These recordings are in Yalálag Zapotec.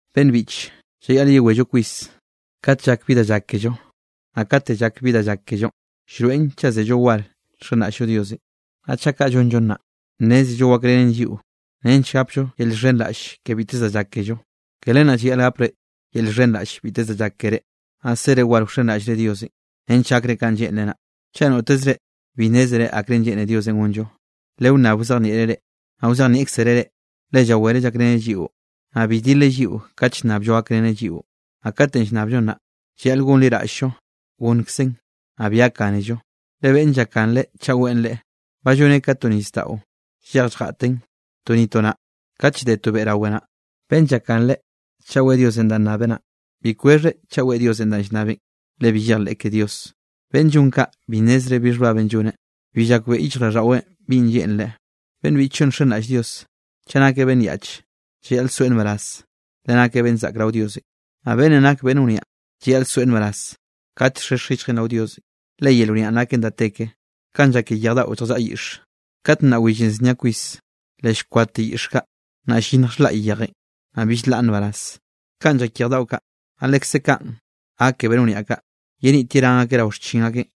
Beꞌnn biꞌche, llayaꞌl yewello kwis kat llak bi da llak kello. Naꞌ kate llak bi da llak kellonꞌ, llroeꞌn chaꞌ zello da war nxenraꞌll-llo Diosenꞌ. Naꞌ chaꞌ kaꞌ llonllo naꞌ, nnézello wakrenen lliꞌo nench gapllo yel llxhenraꞌll ke biteze da llak kello. Ke len naꞌ llayaꞌl gapre yel llxhenraꞌll biteze danꞌ llak ke reꞌ, naꞌ sere war wxenraꞌllre Diosenꞌ nench gakre kanꞌ lleꞌnreꞌ naꞌ. Chaꞌ noteze reꞌ bi nnézere akrenꞌ lleꞌne Diosenꞌ gonllo, lewnnab wzejnieꞌreꞌ reꞌ, naꞌ wzejnieꞌkzereꞌ reꞌ, le llawereꞌ llakreneꞌ lliꞌo, naꞌ bi dileꞌ lliꞌo kat llnnabllo gakreneꞌ lliꞌon. Naꞌ kate nnabllon naꞌ, llayaꞌl gonliraꞌll-llo gonnkzeꞌn, naꞌ bi gakgánello. Le beꞌnn llakganre chaꞌ weꞌen leꞌe, ba lloneꞌ ka to nisdaꞌo llej lljataꞌn, to ni to naꞌ, kat llde to beꞌ rawe naꞌ. Beꞌnn llakganre chaꞌ weꞌe Diosenꞌ danꞌ nnabeꞌ naꞌ, bi kwexheꞌ chaꞌ weꞌe Diosenꞌ danꞌ llnnabeꞌn, le bi llejleꞌ ke Dios. Beꞌnn llon kaꞌ bi nnezreꞌ bi xhbabenꞌ lloneꞌ, bi llakbeꞌe yichjraꞌlldaꞌweꞌn binꞌ lleꞌnreꞌ. Beꞌnn biꞌchllo nxenraꞌll Dios, chaꞌ nakeꞌ beꞌnn yaꞌch, llayaꞌl soeꞌ nbaraz, le nakeꞌ beꞌnn zaꞌk rao Diosenꞌ. Naꞌ beꞌnnenꞌ nak beꞌnn wniaꞌ llayaꞌl soeꞌ nbaraz kat llxhexj yichjeꞌ rao Diosenꞌ, le yel wniaꞌn naken da te ke, kanꞌ llak ke yej daꞌo zjallaꞌa yiꞌxe. Kat nnaꞌ willenꞌ znia kwis, le llkwadte yiꞌx kaꞌ, naꞌ llyinnj xhlaꞌy yejenꞌ, naꞌ bill nlaꞌn nbaraz. Kaꞌn llak yej daꞌo kaꞌ, naꞌ lekze kaꞌn gak ke beꞌnn wniaꞌ kaꞌ, yenit yerán akeꞌ rao xchin akeꞌ.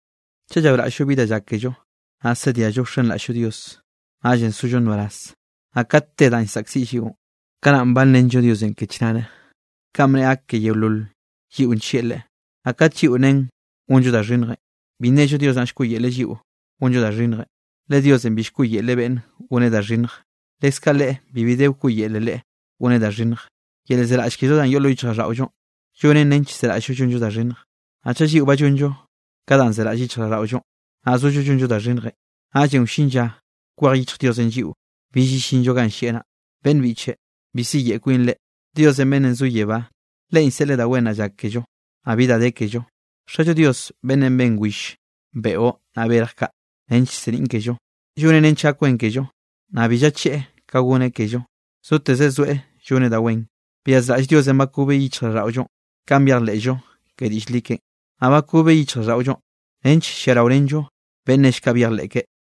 Chaꞌ llaoraꞌll-llo bi da llak kello, naꞌ zediallo wxenraꞌll-llo Dios, naꞌllenꞌ zollo nbaraz. Naꞌ kat te danꞌ zaꞌkziꞌllonꞌ, kanaꞌn banrenllo Diosenꞌ ke chnare kanꞌ bneꞌe gak ke yeolol lliꞌo nllieꞌ Leꞌe. Naꞌ kat lliꞌo nen gonllo da xhinnjenꞌ, bi nnello Dios naꞌn llkoꞌyele lliꞌo gonllo da xhinnjenꞌ, le Diosenꞌ bi llkoꞌyelreꞌ beꞌnne goneꞌ da xhinnj, leskaꞌ Leꞌe bibi de wkoꞌyelen Leꞌe goneꞌ da xhinnj. Yel llzeraꞌll kello danꞌ yoꞌ lo yichjraꞌlldaꞌollonꞌ, llonen nench llzeraꞌll-llo llonllo da xhinnj. Naꞌ chaꞌ lliꞌo ba llonllo ka danꞌ zeraꞌll lo yichjraꞌlldaꞌollonꞌ, naꞌ zollo llonllo da xhinnjenꞌ, naꞌllenꞌ wllin lla kwej yichj Diosenꞌ lliꞌo, bill yellinllo ganꞌ llieꞌ naꞌ. Beꞌnn biꞌche, bi siyeꞌe kwinre. Dios beꞌnnenꞌ zo yebá, Leꞌen llseꞌleꞌ da wen naꞌ llak kello, naꞌ bi da de kello. Xallo Dios beꞌnnenꞌ ben will, beꞌo, naꞌ berj kaꞌ nench llseniꞌn kello, lloneꞌ nench gak wen kello, naꞌ bi llacheꞌe ka goneꞌ kello, zotez zoeꞌ lloneꞌ wen. Byazraꞌll Diosenꞌ bakobeꞌ yichjraꞌlldaꞌollonꞌ kanꞌ byejleꞌllo ke diꞌll li keꞌen. Naꞌ bakobeꞌ yichjraꞌlldaꞌollonꞌ nench lliaraorenllo beꞌnn nell kaꞌ byejleꞌ keꞌe.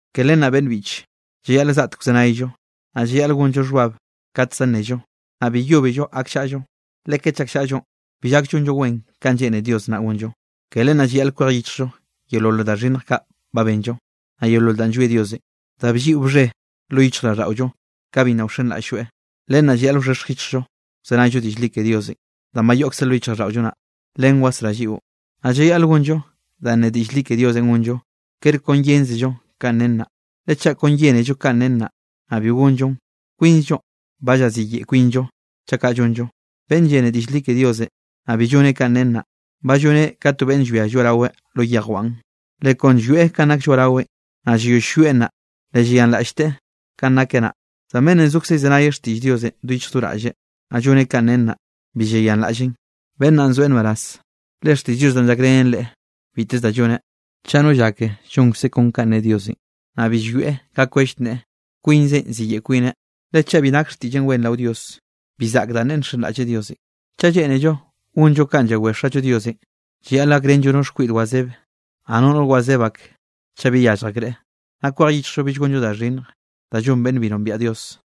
Ke len naꞌ beꞌnn biꞌche, llayaꞌl zgaꞌtek wzenayllo, naꞌ llayaꞌl gonllo xhbab kat za nnello, naꞌ bi yóbello gakllaꞌllo. Le kat llakllaꞌllonꞌ, bi llak llonllo wen kanꞌ lleꞌne Dios naꞌ gonllo. Ke len naꞌ llayaꞌl kwej yichjllo yeolol da xhinnj ba benllo, naꞌ yeolol da llwie Diosenꞌ, da blliꞌo bxhe lo yichjraꞌlldaꞌollo ka bi nna wxenraꞌll-lloeꞌ. Len naꞌ llayaꞌl wxhexj yichjllo wzenayllo diꞌll li ke Diosenꞌ, danꞌ ba yoꞌkze lo yichjraꞌlldaꞌollo naꞌ, len wasrá lliꞌo. Naꞌ llayaꞌl gonllo danꞌ ne diꞌll li ke Diosenꞌ gonllo, kere kon yénzello kanꞌ nen naꞌ. Le chaꞌ kon llénello kanꞌ nen naꞌ, naꞌ bi gonllon, kwinzllonꞌ ba llaziyeꞌe kwinllo chaꞌ kaꞌ llonllo. Beꞌnn llene diꞌll li ke Diosenꞌ, naꞌ bi lloneꞌ kanꞌ nen naꞌ, ba lloneꞌ ka to beꞌnn llwia lloaꞌraweꞌ lo yejwan. Le kon llwieꞌ kanꞌ nak lloaꞌraweꞌn, naꞌ llayoll llwieꞌn naꞌ, le llayanraꞌllteꞌ kanꞌ nakeꞌ naꞌ. Zan beꞌnnenꞌ zokze llzenaye xtiꞌll Diosenꞌ do yichj do raꞌlleꞌ, naꞌ lloneꞌ kanꞌ nen naꞌ, bi llayanraꞌlleꞌn, beꞌnn naꞌn zoeꞌ nbaraz, le xtiꞌll Dios naꞌn llakrenen leꞌe biteze da lloneꞌ. Chaꞌ no llake llonkzeꞌ kon ka ne Diosenꞌ, naꞌ bi llwieꞌ ka kwell nneꞌe, kwinzeꞌ ziyeꞌe kwineꞌ. Le chaꞌ bi nak xtiꞌlleꞌn wen rao Dios, bi zaꞌk danꞌ neꞌe nxenraꞌlleꞌ Diosenꞌ. Chaꞌ lleꞌnello gonllo kanꞌ llawé Xallo Diosenꞌ, llayaꞌl gakrenllo no xkwiꞌd wazebe, naꞌ no noꞌr wazeb ak, chaꞌ bi yallj akreꞌ, naꞌ kwej yichjllo bill gonllo da xhinnj da llon beꞌnn bi nombiaꞌ Dios.